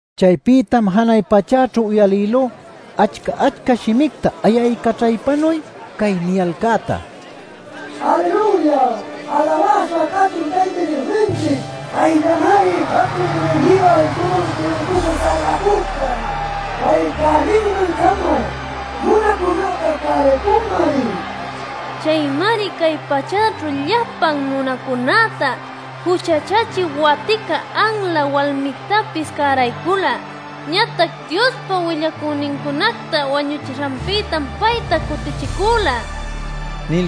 Chaypïtam janay pachäćhu uyalïlú achca-achca shimicta ayaycaćhaypanuy cay niyalcäta: “¡Aleluya! ¡Alawäśha cachun Tayta Diosninchic! Payllamari jatun munayniyu altuman juluycuśha salbacüca. Pay cäninman-cama nunacunäta cäraycunmari. Chaymari cay pachäćhu llapan nunacunäta juchacachï watica anla walmictapis cäraycula. Ñatac Diospa willacünincunacta wañuchishanpïtam payta cutichicüla” nil.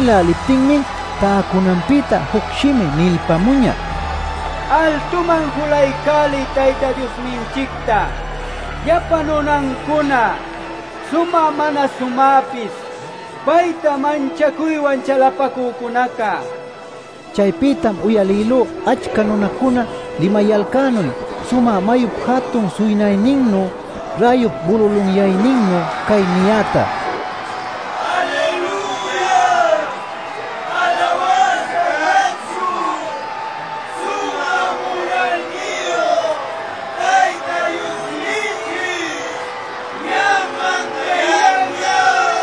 Nïläliptinmi täcunanpïta juc shimi nilpämuñä: “Altuman julaycäliy Tayta Diosninchicta, llapa nunancuna, sumä mana sumäpis, payta manchacuywan chalapacücunaca” nil. Chaypïtam uyalïlú achca nunacuna limayalcänuy, sumä mayup jatun suynayninnu, räyup bululunyayninnu cay niyäta: “¡Aleluya! ¡Alawäśha cachun! Sumä munayniyu Tayta Diosninchic ñam mandayanña.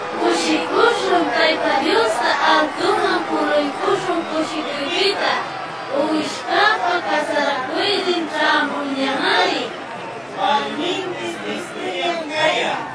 Cushicuśhun, Tayta Diosta altuman juluycuśhun cushicuypïta. Uwishcäpa casaracuynin ćhämunñamari. Walminpis listuñam cayan;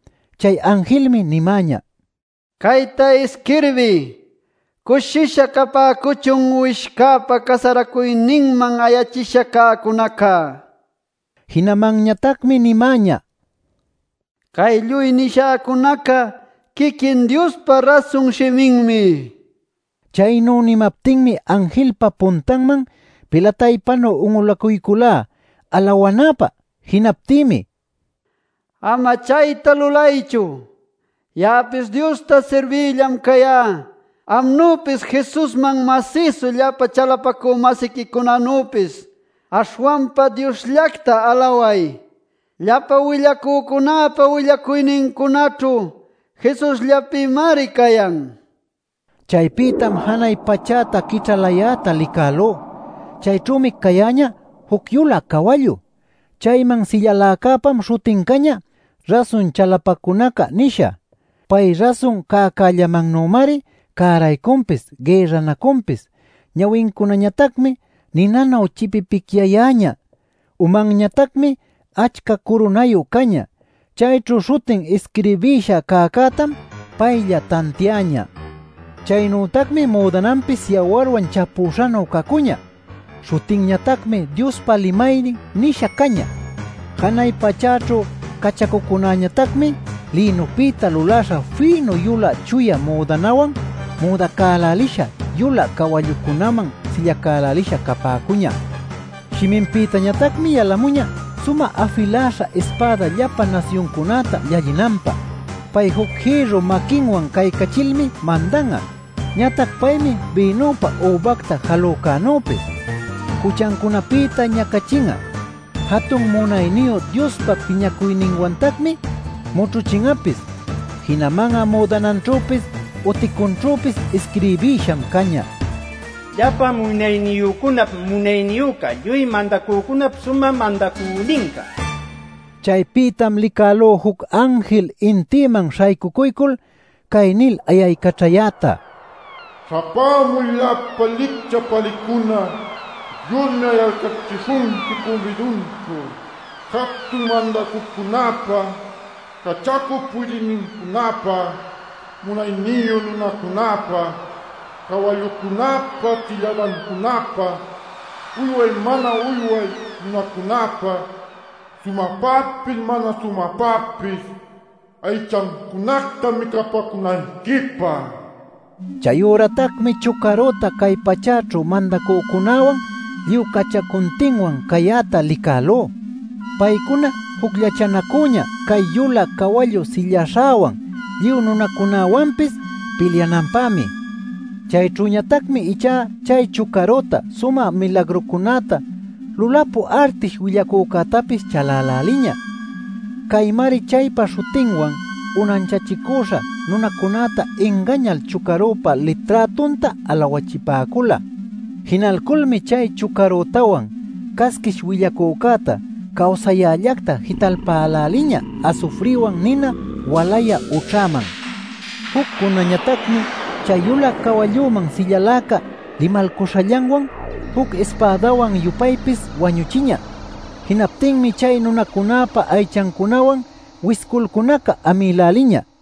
Chay anjilmi nimäñä: “Cayta isquirbiy: ‘Cushisha capäcuchun Uwishcäpa casaracuyninman ayachisha cäcunaca’” nil. Jinamanñatacmi nimäñä: “Cay lluy nishäcunaca quiquin Diospa rasun shiminmi” nil. Chaynu nimaptinmi anjilpa puntanman pilataypanu un'ulacuyculá alawanäpä. Jinaptïmi: “Ama chayta lulaychu. Ya'apis Diosta sirbïllam cayá amnüpis Jesusman masïsu llapa chalapacü-masiquicunanüpis. Aśhwanpa Diosllacta alaway. Llapa willacücunäpa willacuynincunaćhu Jesusllapïmari cayan” nil nimäñä. Chaypïtam janay pachäta quićhalayäta licälú. Chayćhümi cayäñä juc yulä cawallu. Chayman sillaläcäpam śhutin cañä “Rasun Chalapacunaca” nisha. Pay rasun cäcällamannümari cäraycunpis, gïrranacunpis. Ñawincunañatacmi ninanu chipipicyayäñä, umanñatacmi achca curunayu cañä. Chayćhu śhutin isquirbisha cäcätam paylla tantiañä. Chaynütacmi müdananpis yawarwan chapüśhanu cacuñä. Śhutinñatacmi “Diospa Limaynin” nisha cañä. Janay pachäćhu cachacucunäñatacmi lïnupïta luläśha fïnu, yulä, chuya müdanawan müdacälälisha, yulä cawallucunaman sillacälälisha capäcuñä. Shiminpïtañatacmi yalamuñä sumä afiläśha ispäda llapa nasyuncunäta llallinanpä. Pay juc jïrru maquinwan caycachilmi mandan'a. Ñatac paymi bïnupa übacta jalücänüpis juchancunapïta ñacachin'a; jatun munayniyu Diospa piñacuyninwantacmi mućhuchin'apis. Jinaman'a müdananćhüpis uticunćhüpis isquirbïsham cañä: “Llapa Munayniyücunap Munayniyüca Lluy Mandacücunap Sumä Mandacüninca” nil. Chaypïtam licälú juc anjil intïman śhaycucuycul cay nil ayaycaćhayäta: “Śhapämuy llapa licchä pälïcuna, Diosmi ayalcächishunqui cumbidunćhu jatun mandacücunäpa, cachacup puydïnincunäpa, munayniyu nunacunäpa, cawallucunäpa sillädancunäpa, uyway mana uyway nunacunäpa, sumäpapis mana sumäpapis aychancunacta micapäcunayquipä” nil. Chayüratacmi chucarüta cay pachäćhu mandacücunäwan lluy cachacuntinwan cayäta licälú. Paycuna jucllachanacüñä chay yulä cawallun silläśhawan lluy nunancunawanpis pilyananpämi. Chayćhüñatacmi ichá chay chucarüta sumä milagrucunäta lulapü artish willacücätapis chaläläliñä. (Caymari chaypa śhutinwan unanchachicüśha nunacunäta ingañal chucarüpa liträtunta alawachipäcula.) Jinalculmi chay chucarütawan casquish willacücäta cawsayällacta jitalpäläliñä asufriwan nina walayä ućhaman. Juccunätañatacmi chay yulä cawalluman sillaläca limalcuśhallanwan juc ispädawan-yupaypis wañuchiñä. Jinaptinmi chay nunacunäpa aychancunawan wisculcunaca amïläliñä.